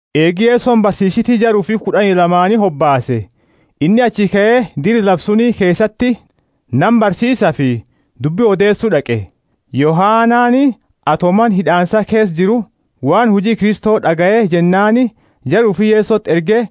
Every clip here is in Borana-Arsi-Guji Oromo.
Eegi Yesoni barsiisiti jara ufi kud'ani lamaani hobaase, inni achii kae dira lafa suni keesati nama barsiisafi dubbi odeesu d'aqe. Yohanani, ato mana hid'aansa keesa jiru, waan huji Kristo d'agaye jennaani jara ufi Yesoti erge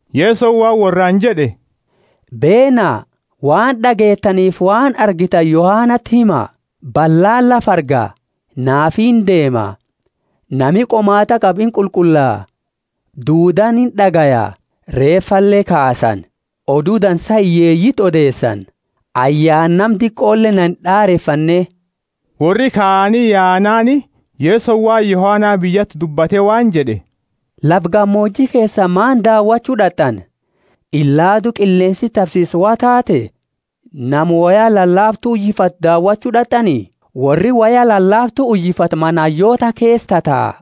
Yesoni waan worraani jed'e, Beena, waan d'ageetanifi waan argitani Yohanati hima: ballaani lafa arga, naafi indeema, nami qomaat'a qabu inqulqulla, duudaani ind'agaya, reefale kaasani, Odu Dansa hiyyeeyiti odeesani. Ayaana nama diqole na ind'arefanne. Worri kaani yaanaani, Yesoni waan Yohana biyyati dubbate waan jed'e, Lafa gamooji keesa maani daawachu d'at'ani? Ilaadu qilleensi tabsiisu wo taate? Nama woya lalaaftu uyifatu daawachu d'at'ani? Worri woya lalaaftu uyifatu mana hayyoota keesa tataa.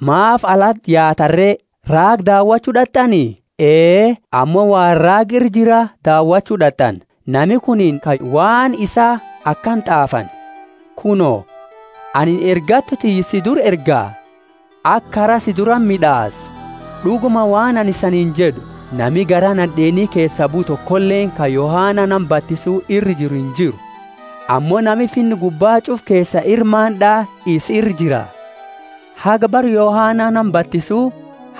Maafi alati yaatani re? Raaga daawachu d'at'ani? Ee, ammo waan raaga ira jira daawachu d'at'ani. Nami kunini ka waan isaa akana t'aafani, Kuno, anini ergattu tiyya si dura erga, aka kara si durati mid'aasu. D'uguma, waan anini isaniini jed'u, Nami garaa nad'eeni keesaa bue tokoleeni ka Yohana nama batisu ira jiru injiru. Ammo nami Finna gubba ch'ufa keesa ira maand'a isa ira jira. Haga, bara Yohana nama batisu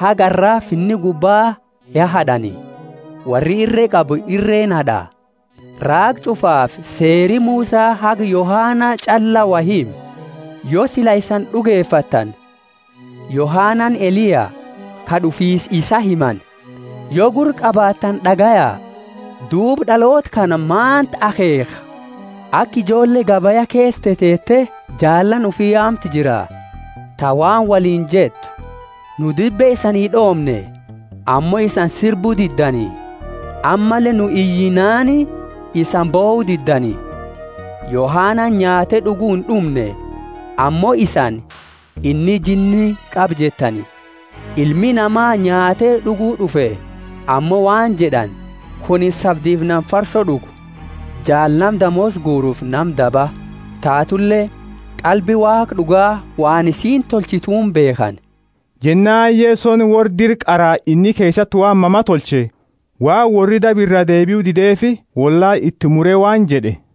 haga arra Finna gubba ya had'ani, worri irre qabu irreeni had'a. Raaga ch'ufaafi Seeri Musa haga Yohana ch'alla woi hime. Yo sila isani d'ugefattani, Yohanani Eliya, ka d'ufiisa isaa himani. Yo gurra qabaattani d'agaya. Duuba d'aloota kana maanti akheekha? Aka ijoolle gabaya keesa teteete jaalaani ufi yaamtu jira, ta waan woliini jettu. Nu dibe isani d'oomne, ammo isani sirbu diddani; ammalle nu iyinnaani isani bohu diddani. Yohanani nyaate d'ugu ind'umne, ammo isani, inni jinni qaba jettani. Ilmi Nama nyaate d'ugu d'ufe, ammo waan jed'ani, Kunini sabdifi nama farso d'ugu, jaala nama, damoosa guurufi nama daba. Tatule, qalbi Waaqa d'uga, waan isiini tolchituuni beekhani. Jennaani Yesoni worra dira qaraa inni keesati waan mama tolche, waan worri daba iraa deebiu dideefi, wollaala iti mure waan jed'e,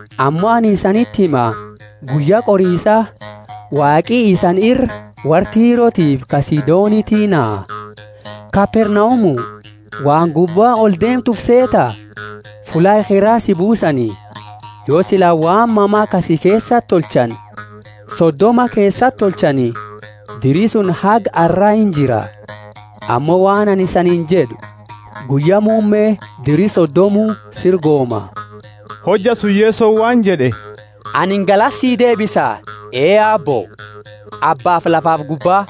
Ammo anini isaniti hima, guyya qorisa Waaqi isani ira worra Tirotiifi ka Sidoniti naha. Kapernaumu, waan gubba oldeemtu ufi seeta? Fulla ekhera si buusani. Yo sila waan mama ka si keesati tolchani Sodoma keesati tolchani, diri suni haga arra injira. Ammo waan anini siini jed'u, Guyya muumme diri Sodoma sira gooma! Hojja suni Yesoni waan jed'e, Anini galata sii deebisa, Ee Aabbo, Abba lafafi gubba,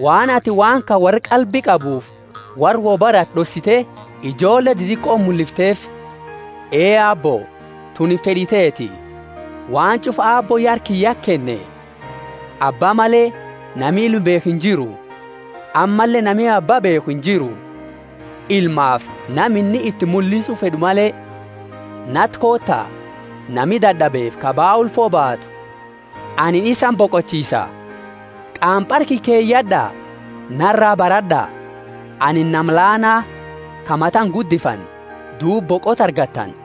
waan atini waan kana worra qalbi qabuufi worra wo barate d'ossite ijoolle didiqoti mullifteefi. Ee Aabbo, tunini fed'i teeti. Waan ch'ufa Aabbooni ya harka kiyyati kenne. Abba male, nami Ilma beekhu injiru, ammalle nami Abba beekhu injiru, Ilmaafi nama inni iti mullisu fed'u male. Nati koota, nami dad'abefi ka baa ulfo baatu anini isani boqachiisa. Qaampara kiyya keyad'a, naraa barad'a, anini nama laana, ka mata inguddifanne; duuba boqota argattani.